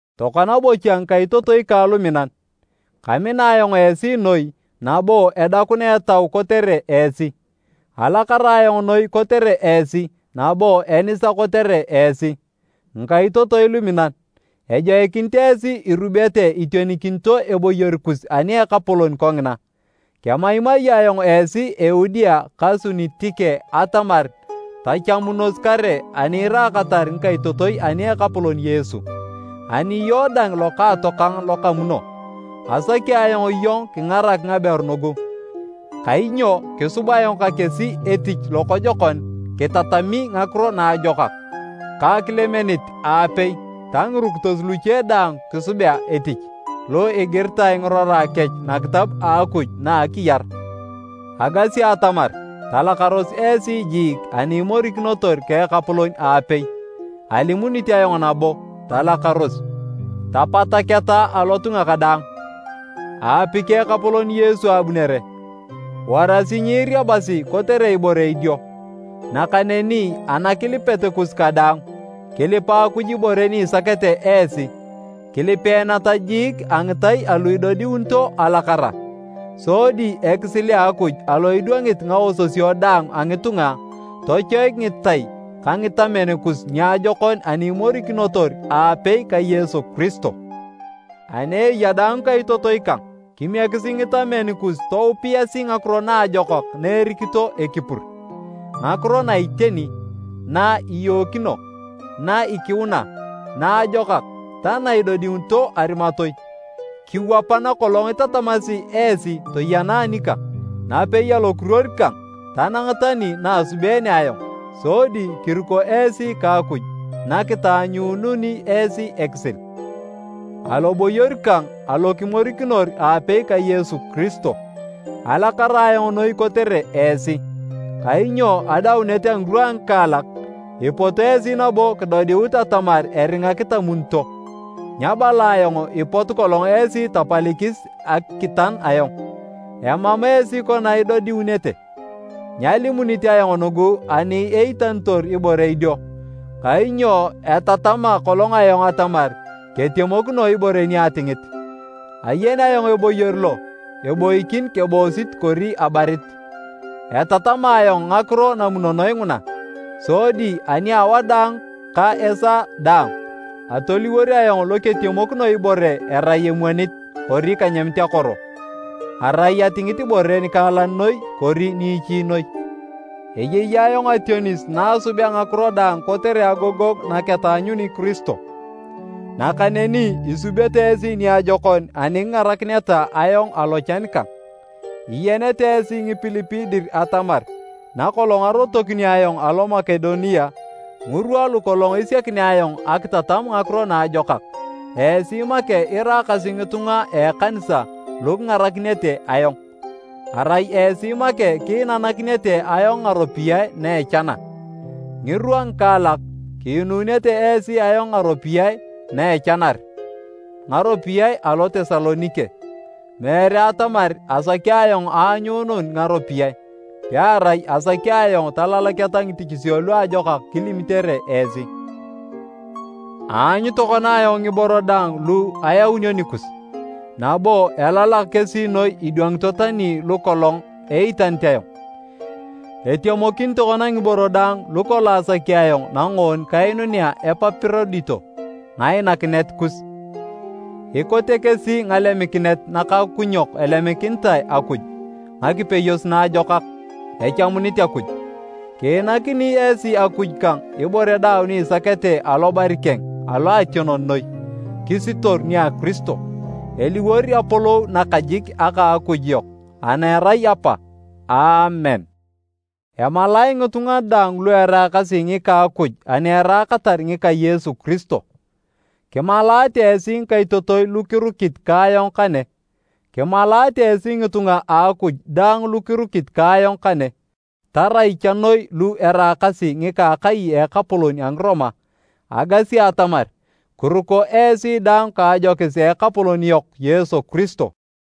Tokona bocha ngikaitotoi kang luminan, kamina ayong esi noi nabo edakuna etau kotere esi! Alakara ayong noi kotere esi nabo enisa kotere esi! Ngikaitotoi luminan, ejoikinit esi irubete itionikinito eboyor kus ani a Ekapolon kongina. Kemaimai ayong esi Eudia ka Sunitike atamar tachamunos kare ani iraakatar ngikaitotoi ani a Ekapolon Yesu. Ani iyong dang lokaatokang lokamuno, asaki ayong iyong kingarak ngaberu nugu, kainyo kisub ayong ka kesi etich lokojokon kitatami ngakiro naajokak, ka Kilemenit aapei ta ngirukitos luche daang kisubea etich, lu igiritae ngirora kech nakitab a Akuj na a akiyar. Agasi atamar talakaros esi jiik ani imorikinotor ka Ekapolon aapei. Alimunit ayong nabo, talakaros! Tapataketa alotunga kadaang. Aapiki Ekapolon Yesu abunere! Warasi nyiiriabasi kotere ibore idio, nakaneni anakilipet kus kadaang, kilipa Akuj ibore ni isakete esi, kilipeeneta jiik a ngitai alu idodiunito alakara. Sodi ekisil a Akuj, lo idwangit ngaososio daang a ngitunga, tochoik ngitai ka ngitamen kus niajokon ani imorikinotor aapei ka Yesu Kiristo. Ani eya daang ngikaitotoi kang, kimiekisi ngitamen kus toupiasi ngakiro naajokak na erikito ekipur, ngakiro na iteni, na iyookino, na ikiuna, naajokak ta na idodiunito arimatoi. Kiwapa nakolong itatamasi esi toyena anikang, napei alokiruor kang tanang tani na asubeene ayong. Sodi kiruko esi ka Akuj na kitaanyuununi esi ekisil. Aloboyor kang alo kimorikinor aapei ka Yesu Kiristo, alakara ayong noi kotere esi. Kainyo adaunet a ngirwa a ngikaalak, ipot esi nabo kidodiut atamar eringa kitamunito. Nyabala ayong ipotu kolong esi tapalikis akitan ayong, amam esi kona idodiunete. Nyalimunit ayong nugu ani eitanitor ibore idio, kainyo etatama kolong ayong atamar ketemokino ibore ni atingit. Ayen ayong eboyor lo eboikin keboosit kori abarit. Etatama ayong ngakiro namunonoe nguna, sodi ani a wadaang ka esaa daang, atoliwor ayong lo ketemokino ibore erai emwonit kori kanyamit akoro, arai atingit ibore nikaalan noi kori niichi noi. Eyei ayong ationis na asubea ngakiro daang kotere agogongu naketaanyuni Kiristo. Nakaneni, isubete esi niajokon ani kingarakineta ayong alochan kang. Iyenete esi Ngipilipi dir atamar nakolong arotokinio ayong alo Makedonia ngirwa lukolong esiakinea ayong akitatam Ngakiro Naajokak, esi make iraakasi ngitunga a ekanisa lu kingarakinete ayong. Arai esi make kiinanakinete ayong ngaropiyae na echana. Ngirwa ngikaalak, kiinunete esi ayong ngaropiyae na echanar ngaropiyae alo Tesalonike. Meere atamar asaki ayong aanyuunun ngaropiyae, pearai asaki ayong talalaketa ngitichisio luajokak kilimitere esi. Aanyu tokona ayong ngiboro daang lu ayaunio anikus, nabo elalak kesi noi idwangito tani lukolong eitanit ayong! Etemokin tokona ngiboro daang lukolong asaki ayong nangoon kainunea Epapirodito ngainakinet kus. Ikote kesi ngalemikinet nakakukunyok elemikinitae Akuj, ngakipeyos naajokak, echamunit Akuj. Kiinakini esi Akuj kang ibore daang ni isakete alobari keng aloationon noi, kisitoru nia Kiristo. Eliwor apolou nakajik aka a Akuj yok ana erai Apa! Aamen. Emalae ngitunga daang lu eraakasi ngika Akuj ani eraakatar ngika Yesu Kiristo. Kimalaate esi ngikaitotoi lu kirukit ka ayong kane. Kimalaate esi ngitunga a Akuj daang lu kirukit ka ayong kane, tarai cha noi lu eraakasi ngika akai a ekapolon a Ngiroma. Agasi atamar kiruko esi daang ka ajokis a Ekapolon yok Yesu Kiristo.